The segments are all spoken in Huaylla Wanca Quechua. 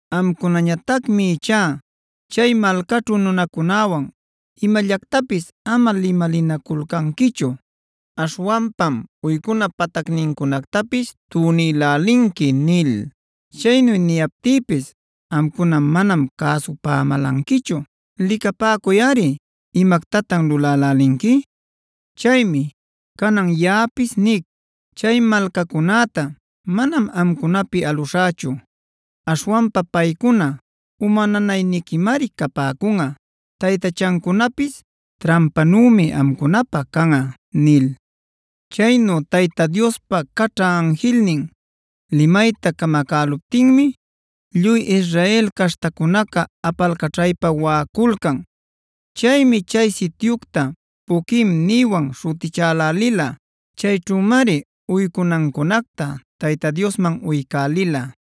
Amcunañatacmi ichá chay malcaćhu nunacunäwan imallactapis ama limalinaculcanquichu. Aśhwanpam uycuna patacnincunactapis tunïlälinqui’ nil. Chaynu niyaptïpis amcuna manam cäsupämälanquichu. Licapäcuyꞌari, ¿imactatan lulälälinqui? Chaymi canan yaꞌapis nic: ‘Chay malcacunäta manam amcunapi aluśhächu. Aśhwanpa paycuna uma nanayquimari capäcunꞌa; taytachancunapis trampanümi amcunapä canꞌa’” nil. Chaynu Tayta Diospa caćha anjilnin limayta camacäluptinmi lluy Israel caśhtacunaca apalcaćhaypa waꞌaculcan. Chaymi chay sityucta “Boquim”a nïwan śhutichälälila. Chayćhümari uycunancunacta Tayta Diosman uycälila.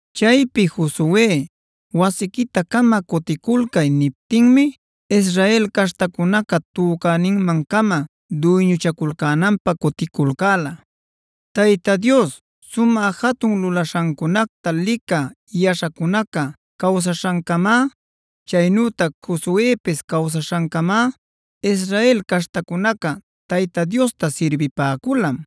Chaypi Josue “wasiquita-cama cuticulcay” niptinmi Israel caśhtacunaca tücaninman-cama duyñuchaculcänanpä cuticulcäla. Tayta Dios sumä jatun lulaśhancunacta licä yaśhacunaca cawsaśhancamá, chaynütac Josuepis cawsaśhancamá Israel caśhtacunaca Tayta Diosta sirbipäculam.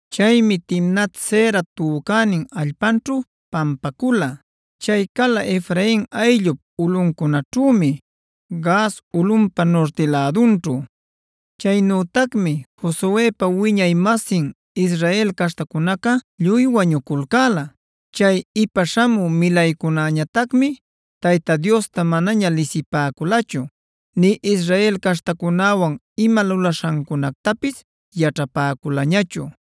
Chaymi Timnat-sera tücänin allpanćhu pampacula. Chay cala Efrain ayllup ulꞌuncunaćhümi, Gaas ulꞌunpa nurti lädunćhu. Chaynütacmi Josuepa wiñay-masin Israel caśhtacunaca lluy wañuculcäla. Chay ipa śhamü milaycunäñatacmi Tayta Diosta manaña lisipäculachu, nï Israel caśhtacunäwan ima lulaśhancunactapis yaćhapäculañachu.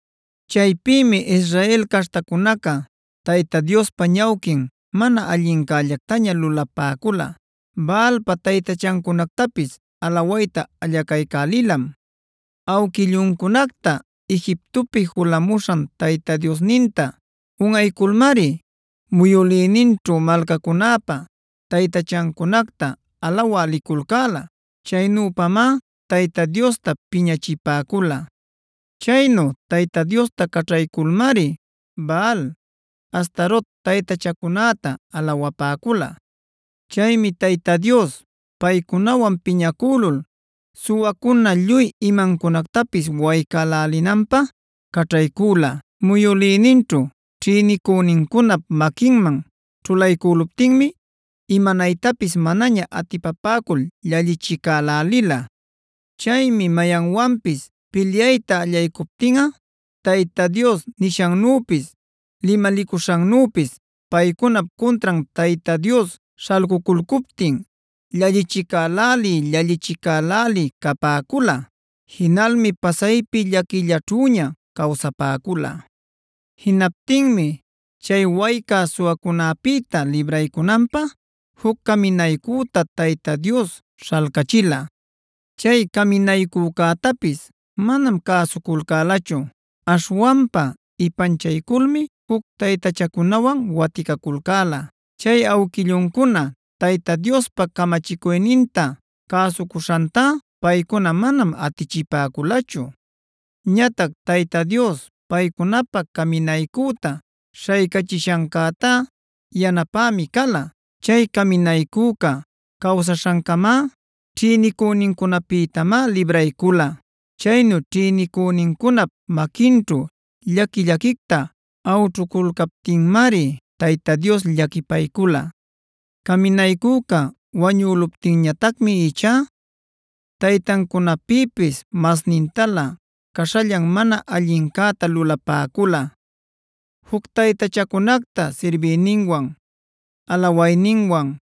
Chaypïmi Israel caśhtacunaca Tayta Diospa ñawquin mana allinllactaña lulapäcula; Baalpa taytachancunactapis alawayta allacaycälilam. Awquilluncunacta Egiptopi julamuśhan Tayta Diosninta unꞌayculmari, muyülïninćhu malcacunäpa taytachancunacta alawä liculcäla. Chaynüpamá Tayta Diosta piñachipäcula. Chaynu Tayta Diosta caćhayculmari Baal, Astarot taytachacunäta alawapäcula. Chaymi Tayta Dios paycunawan piñacülul suwacuna lluy imancunactapis waycälälinanpä caćhaycüla. Muyülïninćhu ćhïnicünincunap maquinman ćhulaycüluptinmi imanaytapis manaña atipapäcul llallichicälälila. Chaymi mayanwanpis pilyayta allaycuptinꞌa Tayta Dios nishannüpis, limalicuśhannüpis paycunap cuntran Tayta Dios śhalcuculcuptin llallichicälälï-llallichicälälï capäcula. Jinalmi pasaypi llaquillaćhüña cawsapäcula. Jinaptinmi chay waycä suwacunäpïta libraycunanpä juc caminaycüta Tayta Dios śhalcachila. Chay caminaycücätapis manam cäsuculcälachu. Aśhwanpa ipanchayculmi juc taytachacunawanb waticaculcäla. Chay awquilluncuna Tayta Diospa camachicuyninta cäsucuśhantá paycuna manam atichipäculachu. Ñatac Tayta Dios paycunapä caminaycüta śhaycachishancäta yanapämi cala. Chay caminaycüca cawsaśhancamá ćhïnicünincunapïtamá libraycula. Chaynu ćhïnicünincunap maquinćhu llaqui-llaquicta awćhuculcaptinmari Tayta Dios llaquipaycula. Caminaycüca wañüluptinñatacmi ichá taytancunapïpis masnintalä caśhallan mana allincäta lulapäcula, juc taytachacunacta sirbiyninwan, alawayninwan.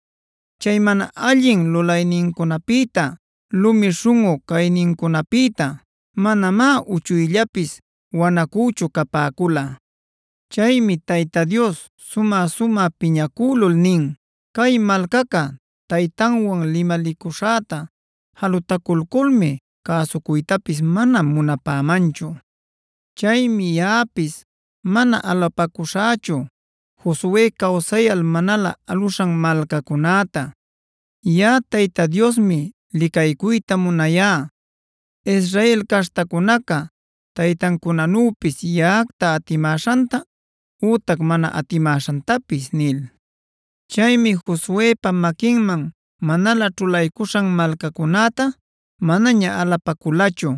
Chay mana allin lulaynincunapïta, lumi śhunꞌu caynincunapïta manamá uchuyllapis wanacüchu capäcula. Chaymi Tayta Dios sumä-sumä piñacülul nin: “Cay malcaca taytanwan limalicuśhäta jalutaculculmi cäsucuytapis mana munapämanchu. Chaymi yaꞌapis mana alapacuśhächu Josue cawsayal manalä aluśhan malcacunäta. Yaꞌa Tayta Diosmi licaycuyta munayá Israel caśhtacunaca taytancunanüpis yaꞌacta atimäśhanta ütac mana atimäśhantapis” nil. Chaymi Josuepa maquinman manalä ćhulaycuśhan malcacunäta manaña alapaculachu;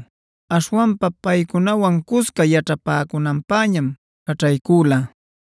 aśhwanpa paycunawan cusca yaćhapäcunanpäñam caćhaycüla.